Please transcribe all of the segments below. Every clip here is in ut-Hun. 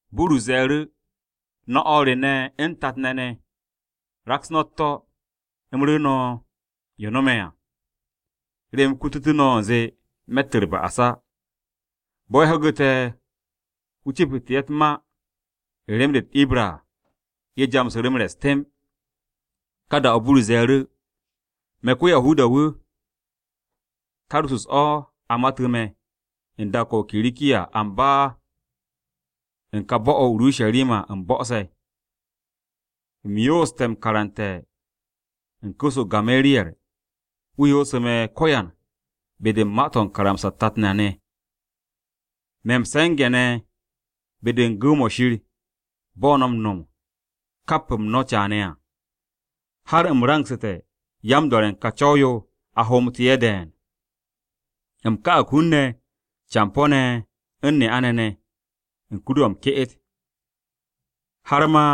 Burus ze̱e̱ru̱, “No̱ o̱r re ne̱ u̱n tat-ne̱ ne̱, raks no̱ u̱t-to̱, u̱m ru̱ru̱ no̱ yo no̱me̱ à, remen u̱m kututú̱ no̱ u̱nze me̱tt u̱r-ba'as á.” Bo̱ ye̱ ho̱gu̱te̱ wu̱ cepu̱te̱ ye̱ u̱t-ma u̱n rem-de u̱t-Ibra à, ye̱ jamsu̱ru̱ m-rest temb. Ka da-o̱, Burus ze̱e̱ru̱: “Me̱ ko-Yahuda-wu̱. Tarsus-o̱ a matu̱ me̱, u̱n dak-o̱ o-Kirikiya, amba u̱n ka bo̱-o̱ o-Urusharima u̱m bo̱'o̱se̱. U̱m yooste̱ m-karante̱ u̱n ku̱s-o Gamariyer, wu̱ yoosu̱ me̱ ko̱yan be-de u̱n ma-to̱ u̱n karamsa-u̱t tat na ne̱. Me̱ m-se̱nge̱ ne̱ be-de u̱n gu̱w-mo̱ Shir, bo̱ no̱ m-no̱m kap-m no̱ caane̱ à. Har u̱m rangsu̱te̱ yan-do̱re̱ u̱n ka Co̱w-yo a hoomtú̱ ye̱ de̱e̱n. U̱m ka'ag hun-ne̱ campo̱-ne̱ u̱n ne'a-ne̱ ne̱, u̱n kur-o̱ m-ke'et. Har ma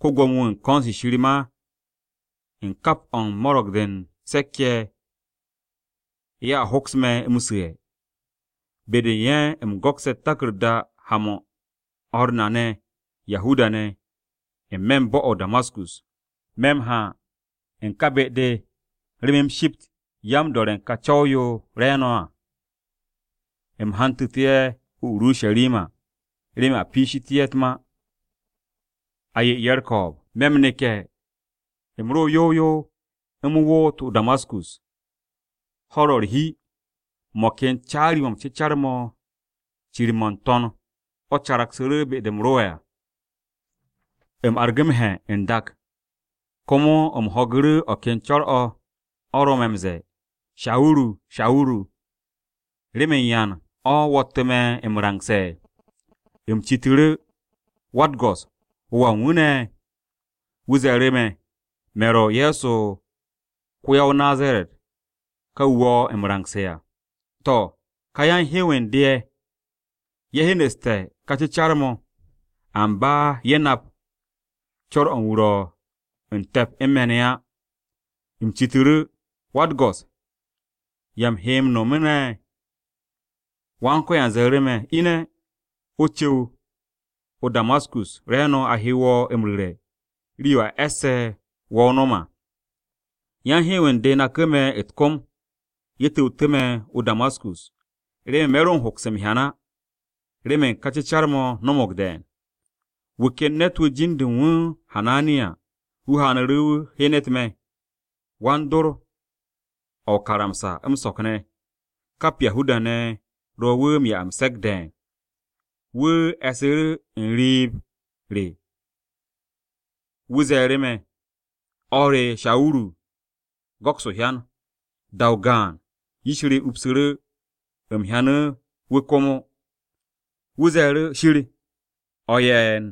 ko-Gwo̱mo-wu̱ u̱n ko̱n-se Shir ma u̱n kap o̱ u̱n Mo̱ro̱g-de u̱n Se̱k-ye̱ ne̱, ye̱a hoks me̱ m-su̱'e̱. Be-de u̱n ye̱ u̱m go̱kse̱ u̱t-taku̱rda haan-mo̱ u̱n o̱r na ne̱ Yahuda-ne̱ n-me̱ bo̱-o̱ o-Damaskus. Me̱ m-ha u̱n ka be-de remen u̱m shipt yan-do̱re̱ u̱n ka co̱w-yo ye̱ ro̱ re̱e̱no̱ à, u̱m hantu̱tu̱ ye̱ o-Urusharima remen a piishité̱ ye̱ u̱t-ma, a 'ye ye̱ u̱r-ko̱o̱b. “Me̱ m-neke̱, u̱m ro yow yow u̱m woot o-Damaskus, ho̱-u̱r ro̱ u̱r-hi. Mo̱ ken caari-mo̱ m-cecar mo̱ cir-mo̱ n-To̱n mo̱ caragsu̱ru̱ be-de u̱m ro'e̱ à. U̱m argu̱ m-he̱ n-dak, komo u̱m ho̱gu̱ru̱ o̱ ken co̱r-o̱, o̱ ro̱ me̱ m-ze̱e̱, ‘Shawuru, Shawuru, ¿remen yan o̱ wo̱ttu̱ me̱ m-rangse̱?’ “U̱m citu̱ru̱, ‘Wa-u̱t-Go̱s, ¿Wo̱ wu̱ wa ne̱?’ “Wu̱ ze̱e̱ru̱ me̱, ‘Me̱ ro̱ Ye̱so ko-ya-o-Nazaret ka wu̱ wo̱ m-rangse̱ à.’ To̱, ka yan-hew u̱n de ye̱, ye̱ hyenu̱ste̱ ka cecar-mo̱, amba ye̱ nap co̱r-o̱ u̱n wu̱ ro̱ u̱n te̱p u̱n me̱ ne̱ á. “U̱m citu̱ru̱, ‘Wa-u̱t-Go̱s, ¿ya u̱m he m-no̱mu̱ ne̱?’ “Wan-Ko̱yan ze̱e̱ru̱ me̱, ‘Ine̱, o cu̱w o-Damaskus, re̱e̱no̱ a he wo̱ m-rure̱ rii-yo a e̱sse̱ wo̱ o nom à.’ Yan-hew u̱n de naku̱ me̱ u̱t-kom. Ye̱ tu̱wtu̱ me̱ o-Damaskus, remen me̱ ro m-hoks m-hyan á remen ka cecar-mo̱ no̱mo̱g de̱e̱n. “Wu̱ ken ne̱t-wu̱ jin-de u̱n wu̱ Hananiya, wu̱ haanu̱ru̱ wu̱ hyenet me̱. Wan-dor-o̱ o-karamsa m-so̱k ne̱, kap Yahuda-ne̱ ro̱ wu̱ m-'ya m-se̱k de̱e̱n. Wu̱ e̱ssu̱ru̱ u̱n riib-o re, wu̱ ze̱e̱ru̱ me̱, ‘O̱r re Shawuru, go̱ks o-hyan.’ Da-o gaan, yish re upsu̱ru̱, u̱m hyanu̱ wu̱ komo. “Wu̱ ze̱e̱ru̱, ‘Shir o̱ u̱n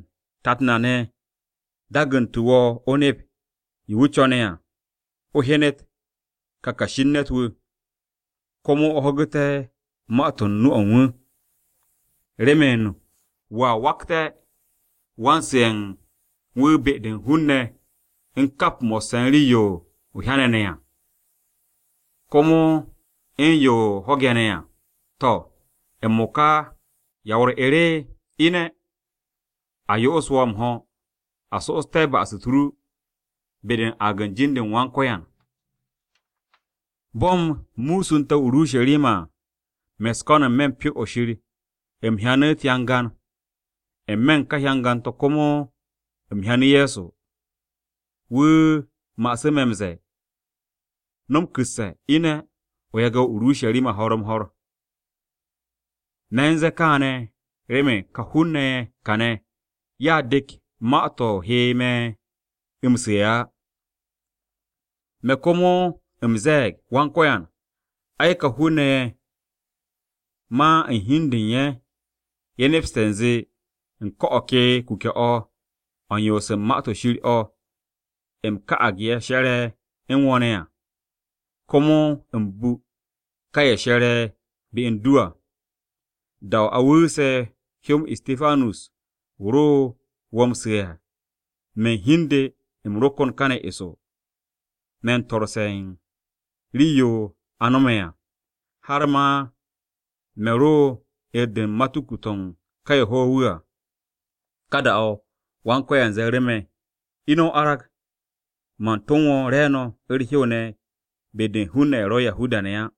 Tat na ne̱ dagantu̱ wo̱ o nep yo wu̱ co̱ne̱ à, o hyenet ka Kashi u̱n Ne̱t-wu̱, komo o ho̱gu̱te̱ ma-to̱ u̱n nu-o̱ u̱n wu̱. Remen wo̱a wakte̱ wan-su̱'e̱ u̱n wu̱ be-de u̱n hun-ne̱ u̱n kap mo̱sse̱ u̱n rii-yo o hyane̱ ne̱ à, komo u̱n yo o ho̱ge̱ ne̱ à. To̱, m-mo̱ka ¿ya wo̱ u̱r-'er? Ine̱, a yo'os wo̱ m-ho̱ a so'oste̱ ba'as-u̱t ru be-de u̱n aag u̱n jin-u̱r Wan-Ko̱yan.’ “Bo̱ u̱m musunte̱ o-Urusharima à, me̱ u̱s-ko̱n n-me̱ u̱n Pyo-o̱ Shir, u̱m hyanu̱ u̱t-hyangan. N-me̱ u̱n ka hyangan-to̱ komo u̱m hyanu̱ Ye̱so. Wu̱ ma'asu̱ me̱ m-ze̱e̱, ‘No̱m ku̱sse̱! Ine̱, o yage̱ o-Urusharima ho̱r-m-ho̱r. Me̱ u̱n ze̱e̱ káane̱, remen ká hun-ne̱ ye̱ kàne̱, ye̱a dek ma-to̱ o he me̱ m-su̱'e̱ á.’ “Me̱ komo u̱m ze̱e̱g, ‘Wan-Ko̱yan, ai ka hun-ne̱ ye̱ ma u̱n hi u̱n de u̱n ye̱, ye̱ nepste̱ u̱nze u̱n ko̱ o̱ ke kuke̱-o̱ u̱n yoos u̱n Ma-to̱ Shir o̱ u̱m ka'ag ye̱ she̱re̱ u̱n wo̱ ne̱ à. Komo u̱m bu ka ye̱ she̱re̱ be u̱n du à. Da-o̱ a wu̱u̱se̱ hyó-m Istipanus wu̱ ro wo̱ m-su̱'e̱ à, me̱ u̱n hi u̱n de, u̱m ro kon kane̱ eso, me u̱n swo̱-se u̱n rii-yo a no̱me̱ à, har ma me̱ ro u̱n 'er-de u̱n matuku-to̱ u̱n ka ye̱ ho̱ wu̱ à. “Ka da-o̱, Wan-Ko̱yan ze̱e̱ru̱ me̱, ‘Ine̱ o arag, man tom wo̱ re̱e̱no̱ u̱r-hew ne̱ be-de u̱n hun-ne̱ ye̱ ro̱ Yahuda-ne̱ á.’”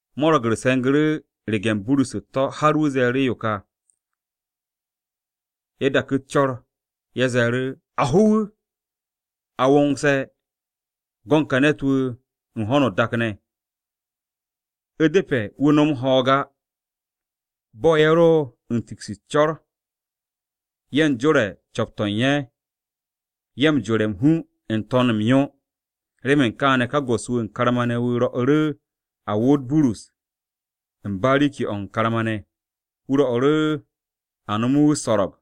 Mo̱ro̱g-u̱r se̱ngu̱ru̱ rege̱n Burus u̱t-to̱ har wu̱ ze̱e̱ru̱ yo ka. Ye̱ daku̱ u̱s-co̱r, ye̱ ze̱e̱ru̱, “A ho wu̱! A wongse̱ go̱n ka ne̱t-wu̱ u̱n ho̱no o-dak ne̱, u̱depe̱ wu̱ nom ho̱o̱g á!” Bo̱ ye̱ ro u̱n dak u̱s-co̱r ye̱ u̱n jore̱ u̱n co̱p-to̱ u̱n ye̱, ye̱ u̱n aas m-hu n-to̱n m-yo. Remen kaane̱ ka go̱s-wu̱ wu̱ u̱n karma-ne̱ wu̱ rwo̱'u̱ru̱ a woot Burus u̱n bariki-o̱ u̱n karma-ne̱. Wu̱ rwo̱'u̱ru̱ a nome̱ wu̱ u̱s-so̱ro̱g,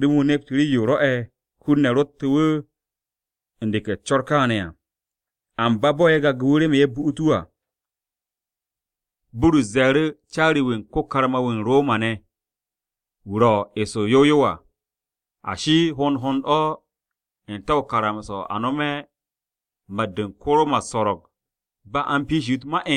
remen wu̱ nept rii-yo rwo̱'e̱ hun-ne̱ ro̱ttu̱ wu̱ u̱n deke̱ u̱s-co̱r kaane̱ à. Amba bo̱ ye̱ gage̱ wu̱ remen ye̱ bu'ut wu̱ à, Burus ze̱e̱ru̱ caari-wu̱ u̱n ko-karma-wu̱ u̱n Roma-ne̱ wu̱ ro̱ eso yow yow à, “Ashi, ¿hond hond o̱ n-te̱ o-karamsa a nome̱ mat-de u̱n ko-Roma u̱s-so̱ro̱g ba a u̱n piishi wu̱ u̱t-ma?”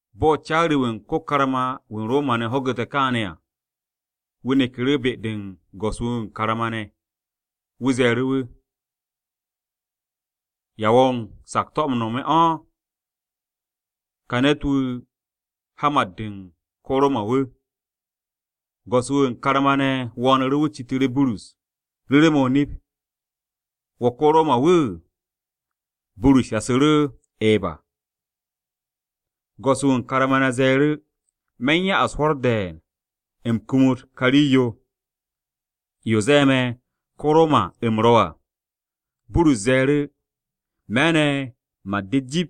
Bo̱ caari-wu̱ u̱n ko-karma-wu̱ u̱n Roma-ne̱ ho̱gu̱te̱ kaane̱ à, wu̱ neku̱ru̱ be-de u̱n go̱s-wu̱ wu̱ karma-ne̱. Wu̱ ze̱e̱ru̱ wu̱, “¿Ya wo̱ u̱n sakto̱-o̱ m-no̱m o̱? Ka ne̱t-wu̱ ha mat-de u̱n ko-Roma-wu̱.” Go̱s-wu̱ u̱n karma-ne̱ wo̱o̱nu̱ru̱ wu̱ citu̱ru̱ Burus, “Ru̱ru̱ me̱ o-nip, ¿wo̱ ko-Roma-wu̱?” Burus shasu̱ru̱, “Eba.” Go̱s-wu̱ u̱n karma-ne̱ ze̱e̱ru̱, “Me̱ u̱n ya'as hwo̱r de̱e̱n u̱m kumut ka rii-yo, yo ze̱e̱ me̱ ko-o-Roma u̱m ro̱ à.” Burus ze̱e̱ru̱, “Me̱ ne̱ mat-de jip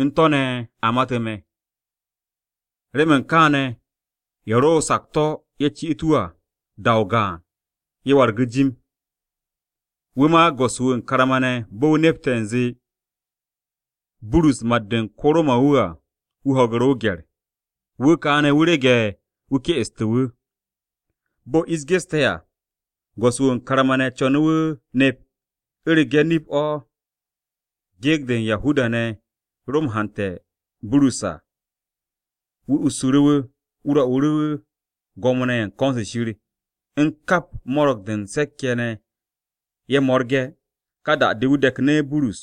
u̱n to̱ ne̱ a matu̱ me̱.” Remen kaane̱ ye̱ ro̱ o-sakto̱ ye̱ cit wu̱ à, da-o gaan ye̱ wargu̱ jim. Wu̱ ma go̱s-wu̱ wu̱ u̱n karma-ne̱ bo̱ wu̱ nepte̱ u̱nze Burus mat-de u̱n ko-Roma-de à wu̱ ho̱gu̱ru̱ o-gye̱r, wu̱ ka ne̱ rege̱ wu̱ ke'estu̱ wu̱. Bo̱ ish geste̱ à, go̱s-wu̱ wu̱ u̱n karma-ne̱ co̱nu̱ wu̱ nep u̱rege̱ nip-o̱ gyekt-se Yahuda-ne̱ ro̱ m-hante̱ u̱n Burus à. Wu̱ ussu̱ru̱ wu̱, wu̱ rwo̱'u̱ru̱ Gwo̱mo-ne̱ ye̱ u̱n ko̱n-se Shir u̱n kap Mo̱ro̱g-de u̱n Se̱k-ye̱ ne̱ ye̱ mo̱rge̱. Ka da-de wu̱ deknu̱ Burus,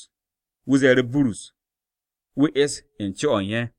wu̱ ze̱e̱ru̱ Burus wu̱ es u̱n co-o̱ u̱n ye̱.